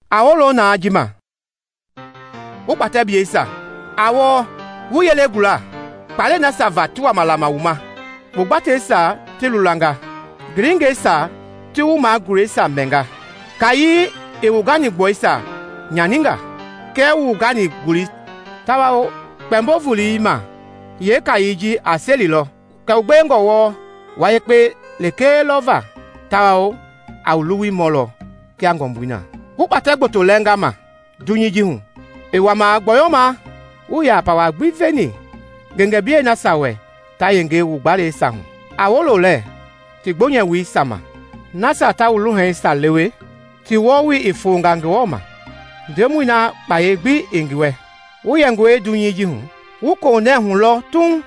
A wolo naa ji ma, wu kpatɛbleisia! A wɔlɔ, wu yelei gula kpaalɛi nasia va ti wama lama wu ma. Wu gbateisia ti lulanga, gilingɛisia ti wu magulɛisia mɛnga. Kaayei i wu ganigbɔli nyaninga kɛɛ wu gani-golei, tawao Kpɛmbo-Volei ma yeekaayei ji a selilɔ kɛ wu gbewengɔ wɔɔ wua yekpe lekee lɔ va tawao a wu luwui mɔlɔ kia ngɔmbui na. Wu kpatɛ gboto lɛnga ma dunyei ji hu i wama gbɔyɔma. Wuii yaa pawa gbi veni ngengeblɛi nasia wɛ ta yenge wu gbalɛisia hu. A wolo lɛɛ ti gboonyɛwoisia ma! Nasia ta wu luhanisia lewe, ti wɔɔwoi i fonga Ngewɔ ma, Ndemɔi na kpayei gbi i ngi wɛ. Wu yɛngɔi hu dunyei hu, wu koohunɛɛ hu lɔ tuuŋ,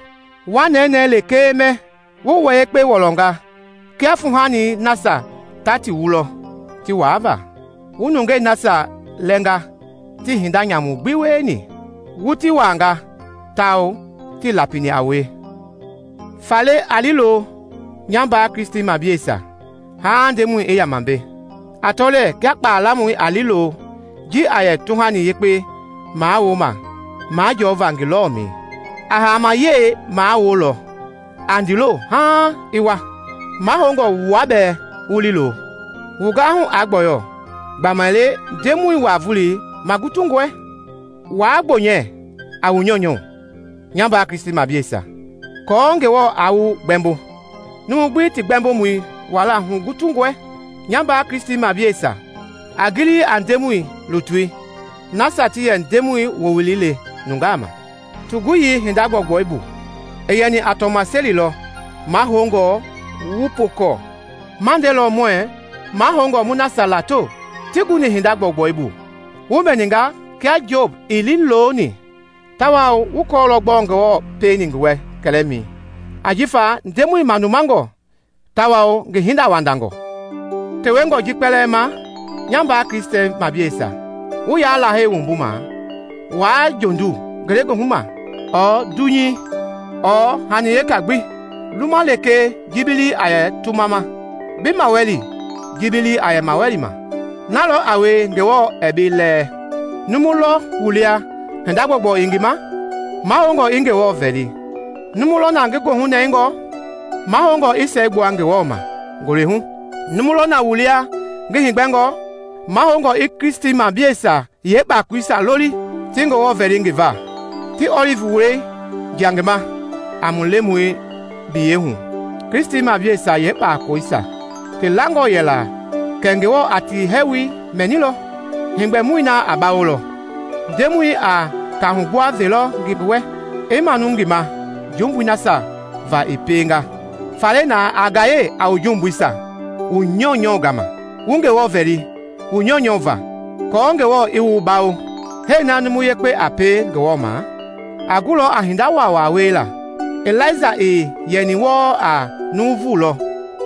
wa nɛnɛɛ lekee mɛ, wu wua yekpe wulɔnga kia fuuhanii nasia ta ti wulɔ ti waava. Wu nungei nasia lɛɛnga tii hinda nyamu gbi wieni, wu ti waanga, tawao tii lapini a wue. Faale a liilo, nya mbaa Kristimableisia, haaŋ Ndemɔi i yama mbei. A tɔ lɛɛ kia kpaa lamɔi a liilo ji a yɛ tuhani yekpe mawuloma majɔɔva ngi lɔlɔmɛi. A haama-yɛi mawulolɔ a ndiilo haaŋ i wua. Mahoungɔe wua bɛɛ wu liilo. Wu gahu aa gbɔyɔ gbamaile Ndemɔi wa-Volei magutungɔe. Waa gboonyɛ a wu nyɔunyɔu, nya mbaa Kristimableisia, aako Ngewɔ aa wu gbɛmbo. Numui gbi ti Gbɛmbomɔi wala hugutungɔe. Nya mbaa Kristimableisia, a gili a Ngewɔ lutui nasia ti yɛ Ndemɔi wowili le nungaa ma. Ti guyii hinda gbɔugbɔu bu i yɛni a tɔmaseli lɔ mahoungɔ wu pookɔɔ. Ma ndelɔ muɛɛ mahoungɔe mu nasia lato ti guni hinda gbɔugbɔu bu. Wu mɛninga kia Job i liiloni, tawao wu kɔɔlɔ gbɔɔ Ngewɔ pieni ngi wɛ kɛlɛmɛi. Ajifa Ndemɔi manumangɔ tawao ngi hindawandangɔ. Tewengɔ ji kpɛlɛɛ ma nya mbaa Kristimableisia, wu yaa Lahei wumbuma waa jondu ngelegoohu ma ɔɔ dunyei ɔɔ hani weka gbi. Luma lekee ji bi lii a yɛ tumɛi ma, bi mawali ji bi lii a mawali ma, na lɔ a wie Ngewɔ ɛɛ bi lɛɛ. Numu lɔ wu lia hinda gbɔugbɔu i ngi ma? Mahoungɔ i Ngewɔ vɛli. Numu lɔ na ngi goohunɛngɔ? Mahoungɔe i siɛgbua Ngewɔ ma ngule hu. Numu lɔ wu lia ngi heegbɛngɔ? Mahoungɔ i Kristimableisia yeekpakoleisia loli ti Ngewɔ vɛli ngi va, ti ɔlivi wulɔi jia ngi ma a mu Lemɔi biyeihu. Kristimableisia yeekpakoloisia ti langɔ yɛngaa la kɛ Ngewɔ a ti hɛɛwoi mɛnilɔ, heegbɛmɔi na a bawolɔ; Ndemɔi a kahugbua velɔ ngi ma, i manu ngi ma jumbui nasia va i pienga. Faale na, a gaye a wu jumbuisia wu nyɔunyɔu gama, wu Ngewɔ vɛli wu nyɔunyɔu va aako Ngewɔ i wu bawo. Hɛɛ na numu yekpei a pie Ngewɔ ma a gulɔ a hinda waawaa wiela. Ilaija i yɛni wɔɔ a nuuvu lɔ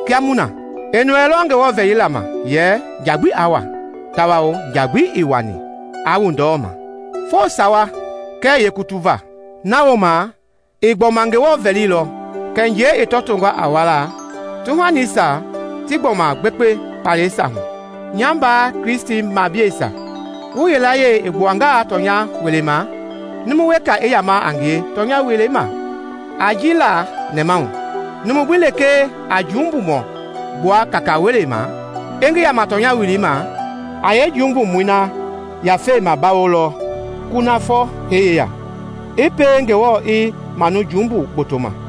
kia mu na. I nɔɛilɔ Ngewɔ vɛlila ma yɛ nja gbi aa wua, tawao nja gbi ii wuani aa wu ndɔlei ma foo sawa kɛɛ yeekutu va. Na wooma i gbɔma Ngewɔ vɛlilɔ kɛ njɛi i tɔtongɔ a wuala, tuhanisia ti gbɔma gbekpe kpaalɛisia hu. Nya mbaa Kristimableisia, wu yilayee i gbuangaa tɔnya welei ma, numu wekei i yama a ngie tɔnya welei ma, a ji la nɛmahu; numu gbi lekee a jumbumɔi gbua kaka-welei ma i ngi yama tɔnya welei ma, a yeejumbumɔi na yafei mabawolɔ kunafɔ hee yeya, i pie Ngewɔ i manu jumbu gboto ma.